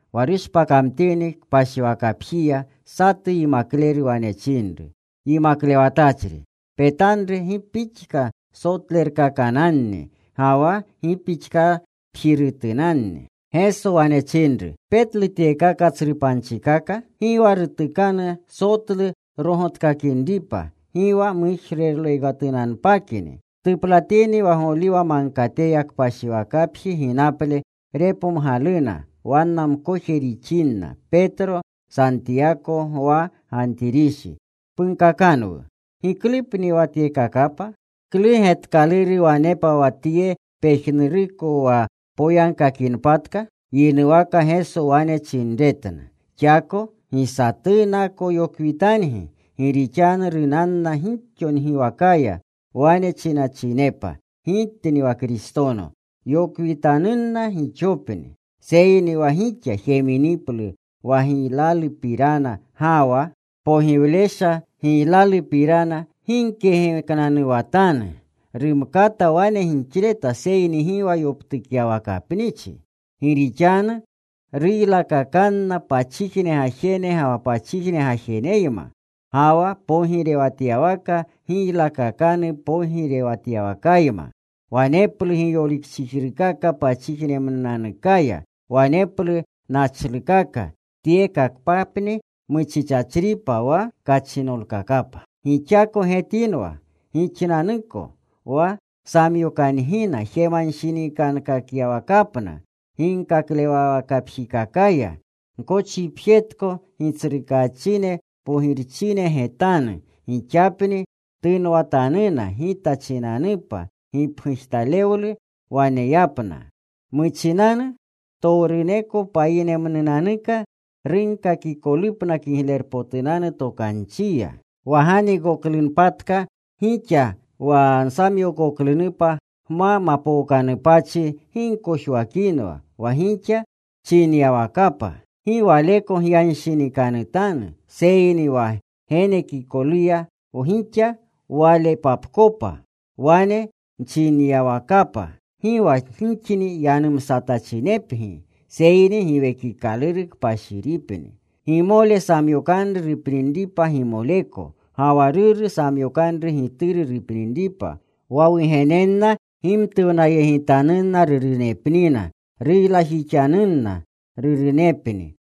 Wa rushpakamtini kpashiwakapjiya, satu yimakleru wane chinru, “Yimaklewatachri, ¡petanru gi pixka sotlerutkakananni, ga wa gi pixkapjirutunanni!” Geso wane chinru, “¿Petlu tyekaka tsru panchikaka? Gi wa rutukanu sotlu rogotkakinripa, gi wa mujrolekatunpakni.” Tuplatini wa Goliwa Magkateya kpashiwakapji ginaple, repomgaluna wanna mkoje rixinna, Petro, Santiyako, Gwa, Gantirishi, “Punkakanwu. ¿Giklupni wa tyekakapa? ¿Klu getkaluru wanepa wa tye pejnuruko wa poyagkakinpatka?” Yinuwaka Geso wane chinretna, “Xako gi satunako yokwitangi. Gi rixanu runanna gixo ngiwakaya, wane chinachinepa, ‘Gitni wa Kristono.’ Yokwitanunna gixopni. “Seyni wa gixa jeminiplu wa giylalupirana ga wa pogiwlesha giylalupirana, gi gkegeknanuwatanu. Rumkata wane gixleta, seyni gi wa yoptukyawakapnichi. Gi rixanu ruylakakanna pachijne gajene ga wa pachijne gajeneyma, ga wa pogirewatyawaka giylakakanu pogirewatyawakayma. Waneplu giyolikchijrukaka pachijnemnunanukaya. Waneplu nachlukaka. Tyekakapni muchichachripa wa kachinolkakapa. “Gixako getinwa gixnanuko. Wa samyokangina jemanshinikankakyawakapna. Ginkaklewawakapjikakaya gkochipjetiko. Gitsrukaachine, pogirchine getanu gixapni tunwatanuna Gita chinanupa gipgujtalewlu waneyapna. Muchinanu ptowruneko payinerumnunanuka runkakikolupna Kiglerpotunanu Tokanchiya. Wa ganiikoklunpatka gixa wa nsamyookoklunupa gma mapookanupachi gi gkojwakinwa wa gixa chinyawakapa. Gi waleko gyanshinikanutanu, seyni wa genekikolupa gixa walepapkopa, wane nchinyawakapa. Gi wa gixni yanumsatachinepgi seyni Giwekikaluru Kpashiripni. “Gimole samyokanru rupninripa gimoleko ga wa ruru samyokanru gituru rupninripa. Wa wugenenna gimtuwnayegitanuna rurunepnina. Ruylajixanunna rurunepni.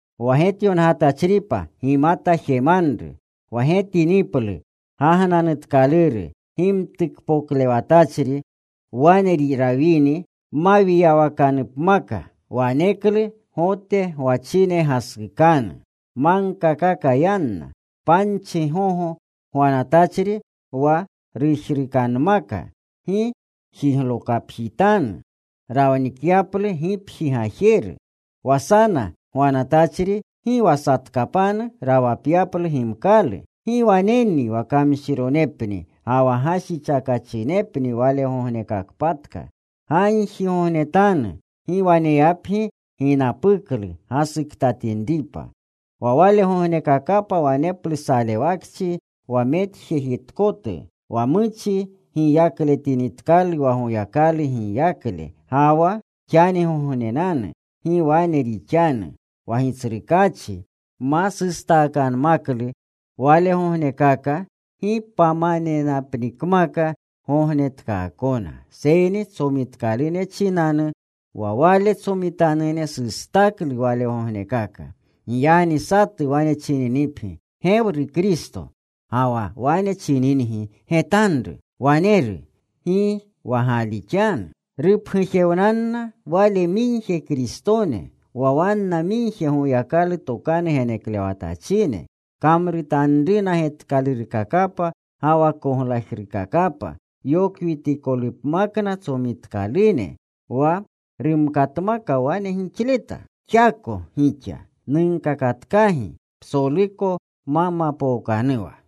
“Wa getyongatachripa gimata jemanru: Wa getiniplu gagnanutkaluru gimtukpotlewatachri wane rawinri mawiyawakanupmaka, waneklu Gote gwachine gasukanu. Magkakaka yanna. Panchi gogo gwanatachri wa rujrukanmaka, gi jiglokapjitanu ranikyaplu gipji gajeru. Wa sana gwanatachri gi wa satkapanu rawapyaplu gimkalu. ¡Gi waneni wa kamshironepni ga wa gashichakachinepni walegognekakpatka! Gagjigognetanu gi waneyapgi ginapuklu gasuktatinripa. Wa walegognekakapa waneplu salewakchi wa mwajejetkatu wa muchi giyakletinitkalu wa Goyakalu giyakle, ga wa xanigognenanu. Gi wane rixanu. Wa Gitsrukaachi ma sustakanmaklu walegognekaka gi pamanenapnikmaka gognetkaakona seyni tsomitkalune chinanu wa Wale tsomitanune sustaklu walegognekaka. Giyagni satu wane chininipgi, ‘¡Gewru Kristo!’ ga wa wane chiningi, ‘¡Getanru. Waneru!’ gi wa galixanu. Rupgujewnanna wale migje Kristone, wa wanna migje Goyakalu tokanu geneklewatachine. Kamrutanruna getkalurkakapa ga wa koglajrukakapa, yokwitikolupmakna tsomitkalune wa rumkatmaka wane gixleta. Xako gixa. Nunkakatkagi psoluko ma mapookanuwa.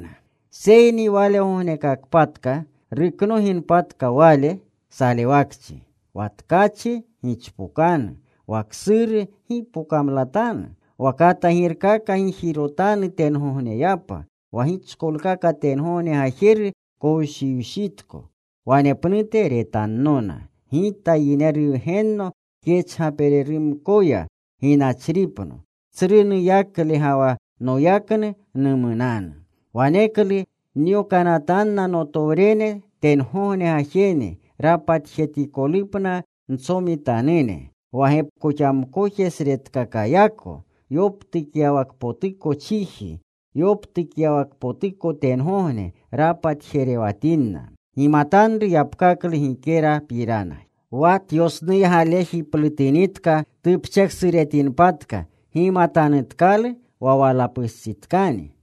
“Seyni walegognekakpatka ruknoginpatka wale salewakchi, wa tkachi gichpokanu. Wa ksuru gi wa pokamlatanu. Wa katagirkaka gijirotanu tengogneyapa. Wa gichkolkaka tengogne gajeru kowshiwshitko. Wanepnute retannona Gita wa Yineru Wgenno kyachgapererumkoya ginachripno. Tsru nuyakle ga wa noyaknu numunanu. Waneklu nyokanatanna notowrene tengogne gajene rapatjetikolupna ntsomitanune. Wa gepkoxamkojesretkakayako yoptukyawakpotuko chiji, yoptukyawakpotuko tengogne rapatjerewatinna. “Gimatanru yapkaklu gikerapiranaya. Wa tyosnuygalejiplutinitka, tupcheksuretinpatka, gimatanutkalu wa walapustsitkani.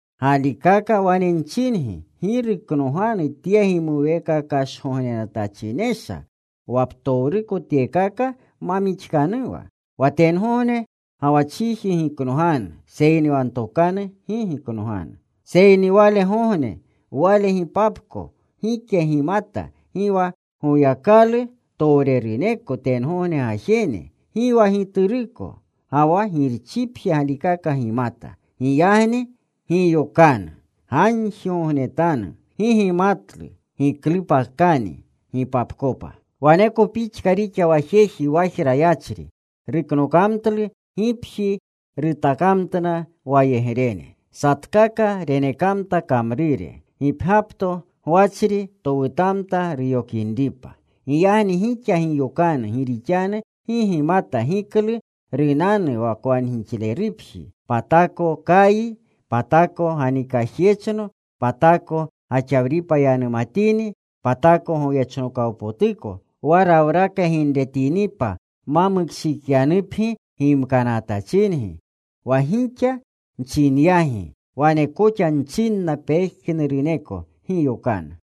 Galikaka wane nchingi, gi ruknoganu tye gimuweekakgognenatachinesha wa ptowruko tyekaka ma mixkanuwa. Wa tengogne ga wa chiji giknoganu, seyni wa ntokanu gi giknoganu. “Seyni walegogne, wale gipapko gike gimata, gi wa Goyakalu towreruneko tengogne gajene, gi wa Gituruko, ga wa Girchipje galikaka gimata. Giyagni giyokanu. Gagjigognetanu. Gi gimatlu giklupaktani gipapkopa. Waneko pixka rixa wa jeji wajra yachri. Ruknokamtlu gipji. Rutakamtna wayegrene. Satkaka renekamta kamrure. Gipgyapto gwachri towutamta ruyokinripa. “Giyagni gixa giyokanu. Gi rixanu gi gimata giklu runanu wa kwangixlerupji, patako kayi, patako ganikajyechno, patako gaxawripa yanumatini, patako goyechnokawpotuko. Wa rawraka ginretinipa ma mukshiikyanupgi gimkanatachingi. Wa gixa nchinyagi wane koxa nchinna pejnuruneko: Giyokanu.”